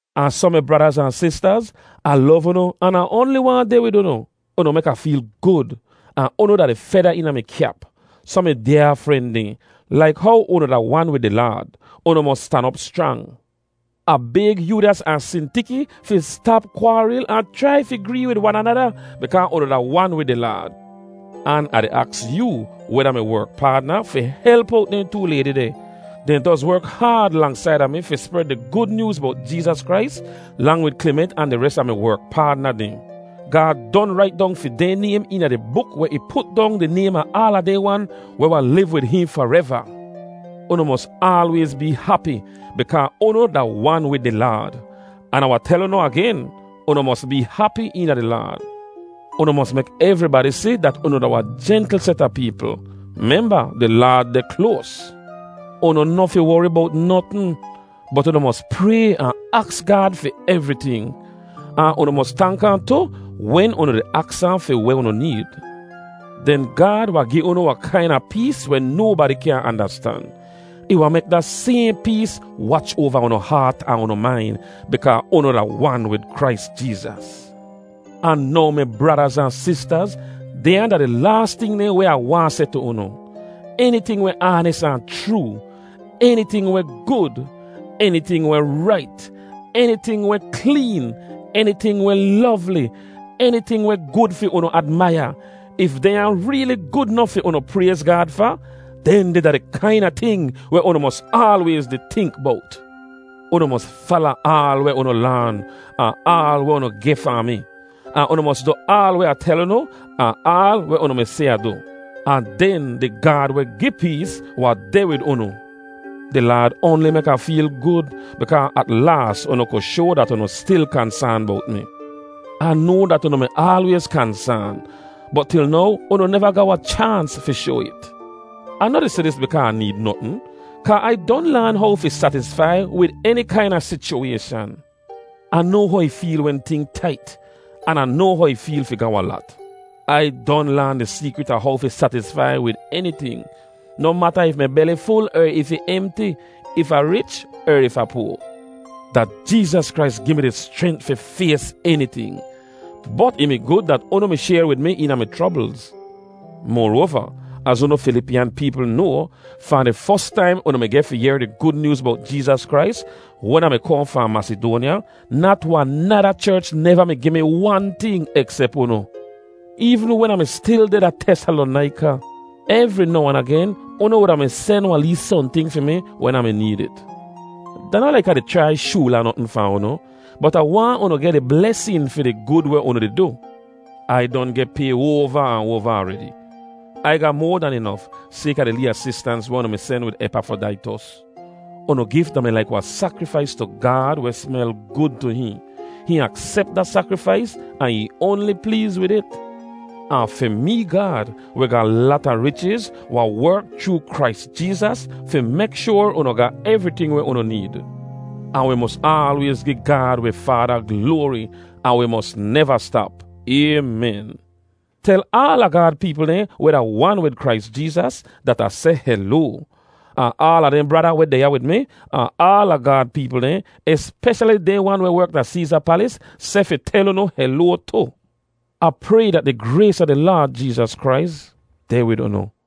Ahn soh mi bradaz ahn sistaz, Ah lov unu an Ah oanli waahn deh wid unu. Unu mek Ah feel gud, ahn unu da di feda eena mi kyap. Soh mi dyaa fren dehn, laik how unu da wan wid di Laad, unu mos stan op schrang. Ah bayg Yoodyas ahn Sintiki fi stap kwaaril ahn chrai fi gree wid wan anada bikaa unu da wan wid di Laad. An Ah di aks yoo, weh da mi werk paadna, fi help owt dehn too laydi deh. Dehn doz werk haad lang saida mi fi spred di Gud Nyooz bowt Jeezas Krais, lang wid Kliment ahn di res a mi werk paadna dehn. Gaad don rait dong fi dehn naym eena di buk weh ih put dong di naym a aala dehn wan weh wahn liv wid hihn fareva. Unu mos aalwayz bee hapi bikaa unu da wan wid di Laad. An Ah wahn tel unu agen: Unu mos bee hapi eena di Laad! Unu mos mek evribadi si dat unu da wahn jentl set a peepl. Memba, di Laad deh kloas. Unu noh fi wori bowt notn, bot unu mos pray ahn aks Gaad fi evriting. Ahn unu mos tank ahn tu wen unu di aks ahn fi weh unu need. Den Gaad wahn gi unu wahn kaina pees weh nobadi kyaahn andastan. Ih wahn mek da sayhn pees wach oava unu haat ahn unu main bikaa unu da wan wid Krais Jeezas. Ahn now mi bradaz ahn sistaz, dehnya da di laas ting dehn weh Ah waahn seh tu unu. Eniting weh aanis ahn chroo, eniting weh gud, eniting weh rait, eniting weh kleen, eniting weh lovli, eniting weh gud fi unu admaiya—if dehnya reeli gud nof fi unu prayz Gaad fa—dehndeh da di kaina ting weh unu mos aalwayz di tink bowt. Unu mos fala aal weh unu laan ahn aal weh unu geh fahn mi, ahn unu mos du aal weh Ah tel unu ahn aal weh unu mi si Ah du. Ahn den di Gaad weh gi pees wahn deh wid unu. Di Laad oanli mek Ah feel gud bikaa at laas unu ku shoa dat unu stil kansaan bowt mi. Ah noa dat unu mi aalwayz kansaan, bot til now unu neva ga wahn chaans fi shoa it. Ah noh di seh dis bikaa Ah need notn, kaa Ai don laan how fi satisfai wid eni kaina sichuwayshan. Ah noa how ih feel wen ting tait, an Ah noa how ih feel fi ga wahn lat. Ai don laan di seekrit a how fi satisfai wid eniting, noh mata if mi beli ful er if ih emti, if Ah rich er if Ah poa. Da Jeezas Krais gi mi di schrent fi fays eniting! Bot ih mi gud dat unu mi shayr wid mi eena mi chroblz. Moroava, az unu Filipiyan peepl noa, fahn di fos taim unu mi geh fi yehr di Gud Nyooz bowt Jeezas Krais, wen Ah mi kohn fahn Masidoanya, nat wahn nada cherch neva mi gi mi wan ting eksep unu. Eevn wen Ah mi stil deh da Tesalonaika, evri now ahn agen unu wuda mi sen wahn lee sohnting fi mi wen Ah mi need it. Da noh laik Ah di chrai shoola notn fahn unu, bot Ah waahn unu geh di blesin fi di gud weh unu di du. Ai don geh pay oava ahn oava aredi. Ai ga moa dan inof, sayka di lee asistans weh unu mi sen wid Epafrodaitos. Unu gif da-mi laik wahn sakrifais tu Gaad weh smel gud tu hihn. Hihn aksep da sakrifais ahn ih oanli pleez wid it. Ahn fi mee Gaad, weh ga wahn lata richiz, wahn werk chroo Krais Jeezas fi mek shoar unu ga evriting weh unu need. Ahn wi mos aalwayz gi Gaad wi Faada gloari, ahn wi mos neva stap. Aymen. Tel aala Gaad peepl dehn weh da wan wid Krais Jeezas dat Ah seh heloa; ahn aala dehn brada weh deh ya wid mi, ahn aala Gaad peepl dehn, espeshali dehn wan weh werk da Seeza palis, seh fi tel unu heloa tu. Ah pray dat di grays a di Laad Jeezas Krais deh wid unu.